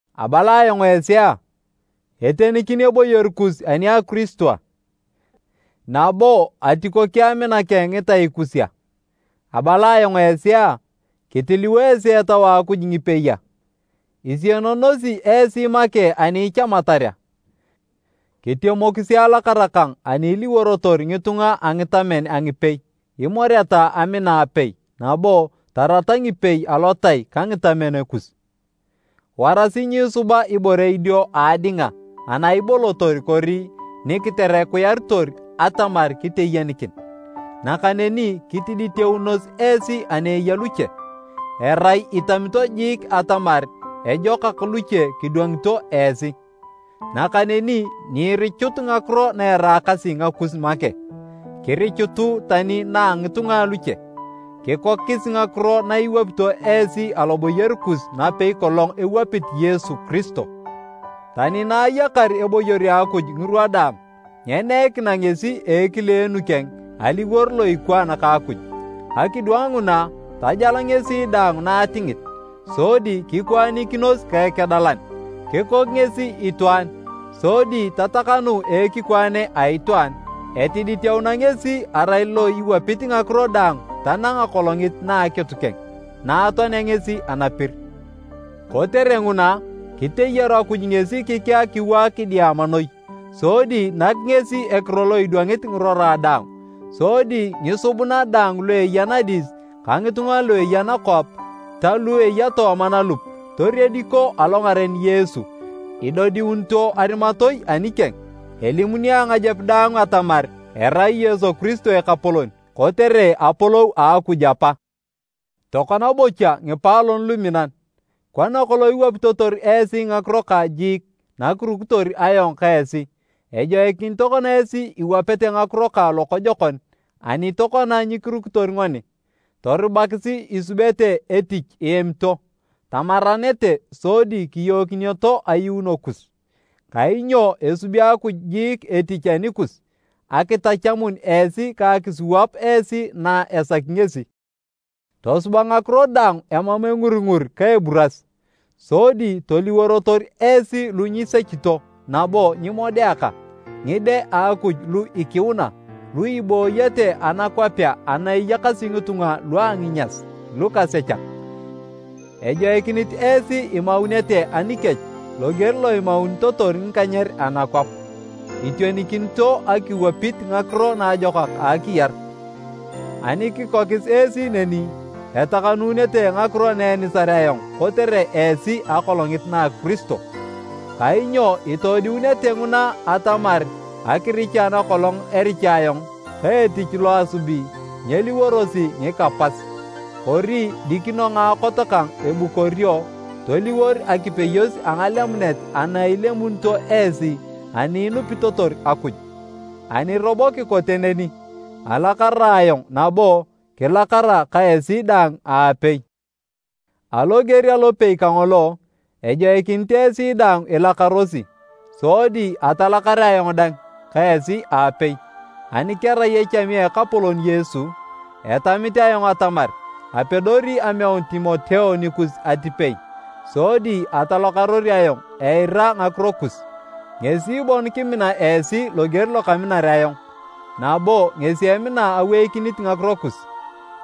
Abala ayong esi a, etenikin eboyor kus ani a Kiristo a, nabo atikoki amina keng ngitai kus a? Abala ayong esi a, kitiliwo esi Etau a Akuj ngipei a? Isienonosi esi make ani ichamatar a? Kitemokisi alakara kang ani iliworotor ngitunga a ngitamen a ngipei, imoreta amina apei nabo tarata ngipei alotai ka ngitamen kus. Warasi nyiisuba ibore idio a adinga ana ibolotor kori ni kiterekuyaritor atamar kiteyenikin, nakaneni kitiditeunos esi ani eya luche, erai itamito jiik atamar ejokak luche kidwangito esi. Nakaneni nyiirichut ngakiro na eraakasi ngakus make, kirichutu tani na a ngitunga aluche. Kikokis ngakiro na iwapito esi aloboyor kus napei kolong ewapit Yesu Kiristo: Tani na ayakar eboyor a Akuj ngirwa daang, nyeneikina ngesi a ekileenu keng, aliwor lo ikwaan ka Akuj. Akidwang nguna, tajal ngesi daang na atingit, sodi kikwaanikinos ka ekedalan. Kikok ngesi itwaan, sodi tatakanu a ekikwaane a itwaan. Etiditeuna ngesi arai lo iwapit ngakiro daang tanang akolongit na a akitu keng, na atoanea ngesi anapir. Kotere nguna, kiteyaru Akuj ngesi kikea kiwaak kidiama noi, sodi nak ngesi ekiro lo idwangit ngirora daang. Sodi ngisubuna daang lu eya nadis ka ngitunga lu eya nakwap ta lu eya tooma nalup, toriediko alongaren Yesu, idodiunito arimatoi anikeng. Elimuni angajep daang atamar erai Yesu Kiristo Ekapolon, kotere apolou a Akuj Apa. Tokona bocha ngipaalon luminan, kona kolong iwapitotor esi ngakiro kang jiik nakirukitor ayong ka esi, ejoikinit tokona esi iwapete ngakiro kang lokojokon ani tokona nyikirukitor ngoni. Torubakisi isubete etich iemito, tamaranete sodi kiyookineto ayuuno kus. Kainyo esubi Akuj jiik etich anikus akitachamun esi ka akisiwap esi na esaki ngesi. Tosuba ngakiro daang emam enguringur ka eburas, sodi toliworotor esi lu nyisechito nabo nyimodeaka, ngide a Akuj lu ikiuna, lu ibooyete anakwapea ana eyakasi ngitunga lua nginyas, lukasechak. Ejoikinit esi imaunete anikech loger lo imaunitotor ngikanyer anakwap, itionikinito akiwapit ngakiro naajokak a akiyar. Ani kikokis esi neni, etakanunete ngakiro na enisar ayong kotere esi akolongit na Kiristo, kainyo itodiunete nguna atamar akiricha nakolong ericha ayong ka etich lo asubi, nyeliworosi ngika pas. Kori dikino ngaakot kang ebukorio toliwor akipeyos a ngalemunet ana ilemunito esi ani inupitotor Akuj. Ani robo kikote neni, alakara ayong nabo kilakara ka esi daang aapei. Aloger alopei kangolo, ejoikinit esi dang ilakarosi sodi atalakar ayong dang ka esi aapei. Ani kerai echami a Ekapolon Yesu, etamit ayong atamar apedori ameun Timoteo nikus atipei, sodi atalakaror ayong eirari ngakiro kus. Ngesi bon kimina esi loger lo kaminar ayong nabo ngesi emina aweikinit ngakiro kus.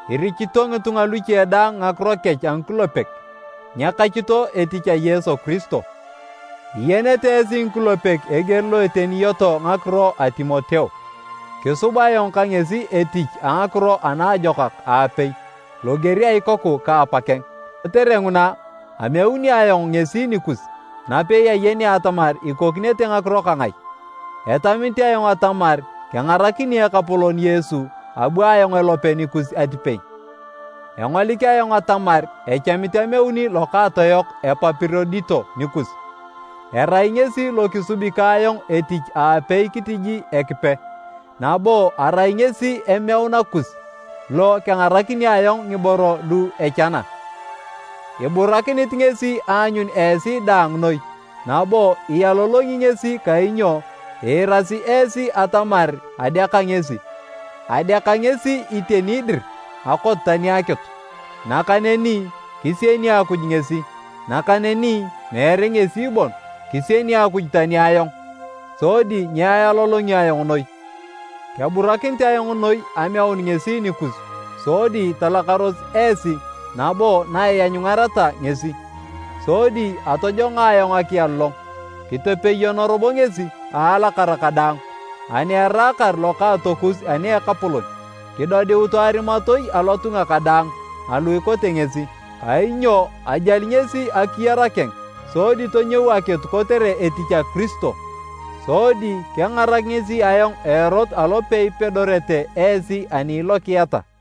Irichito ngitunga luche daang ngakiro kech a ngikulepek, nyekachito etich a Yesu Kiristo. Iyenete esi ngikulepek eger eteniyoto ngakiro a Timoteo, kisub ayong ka ngesi etich a ngakiro ana ajokak aapei, loger a ikoku ka apakeng. Kotere nguna, ameuni ayong ngesi nikus napei ayenea atamar ikokinete ngakiro kang ai. Etamit ayong atamar kengarakini Ekapolon Yesu abu ayong elope nikus atipei. Engolik ayong atamar echamit ameuni lokaatoyok Epapirodito nikus. Erai ngesi lo kisubi ka ayong etich aapei kitiji Ekipe, nabo arai ngesi emeuna kus lo kengarakini ayong ngiboro lu echana. Iburakinit ngesi aanyun esi daang noi nabo ialolongi ngesi kainyo iirasi esi atamar adeaka ngesi. Adeaka ngesi iteni dir akot tani akitu. Nakaneni kisieni Akuj ngesi, nakaneni meere ngesi bon, kisieni Akuj tani ayong, sodi nyealolongio ayong noi. Keburakinit ayong noi ameun ngesi nikus sodi talakaros esi nabo na ianyungareta ngesi, sodi atojongo ayong akialolong. Kitepeyono robo ngesi a alakara kadaang, ani eraakar lokaatokus ani a Ekapolon. Kidodiutu arimatoi alotunga kadaang alu ikote ngesi, kainyo ajali ngesi akiyar keng sodi tonyou akitu kotere etich a Kiristo, sodi kengarak ngesi ayong a erot alo peipedorete esi ani ilokiata.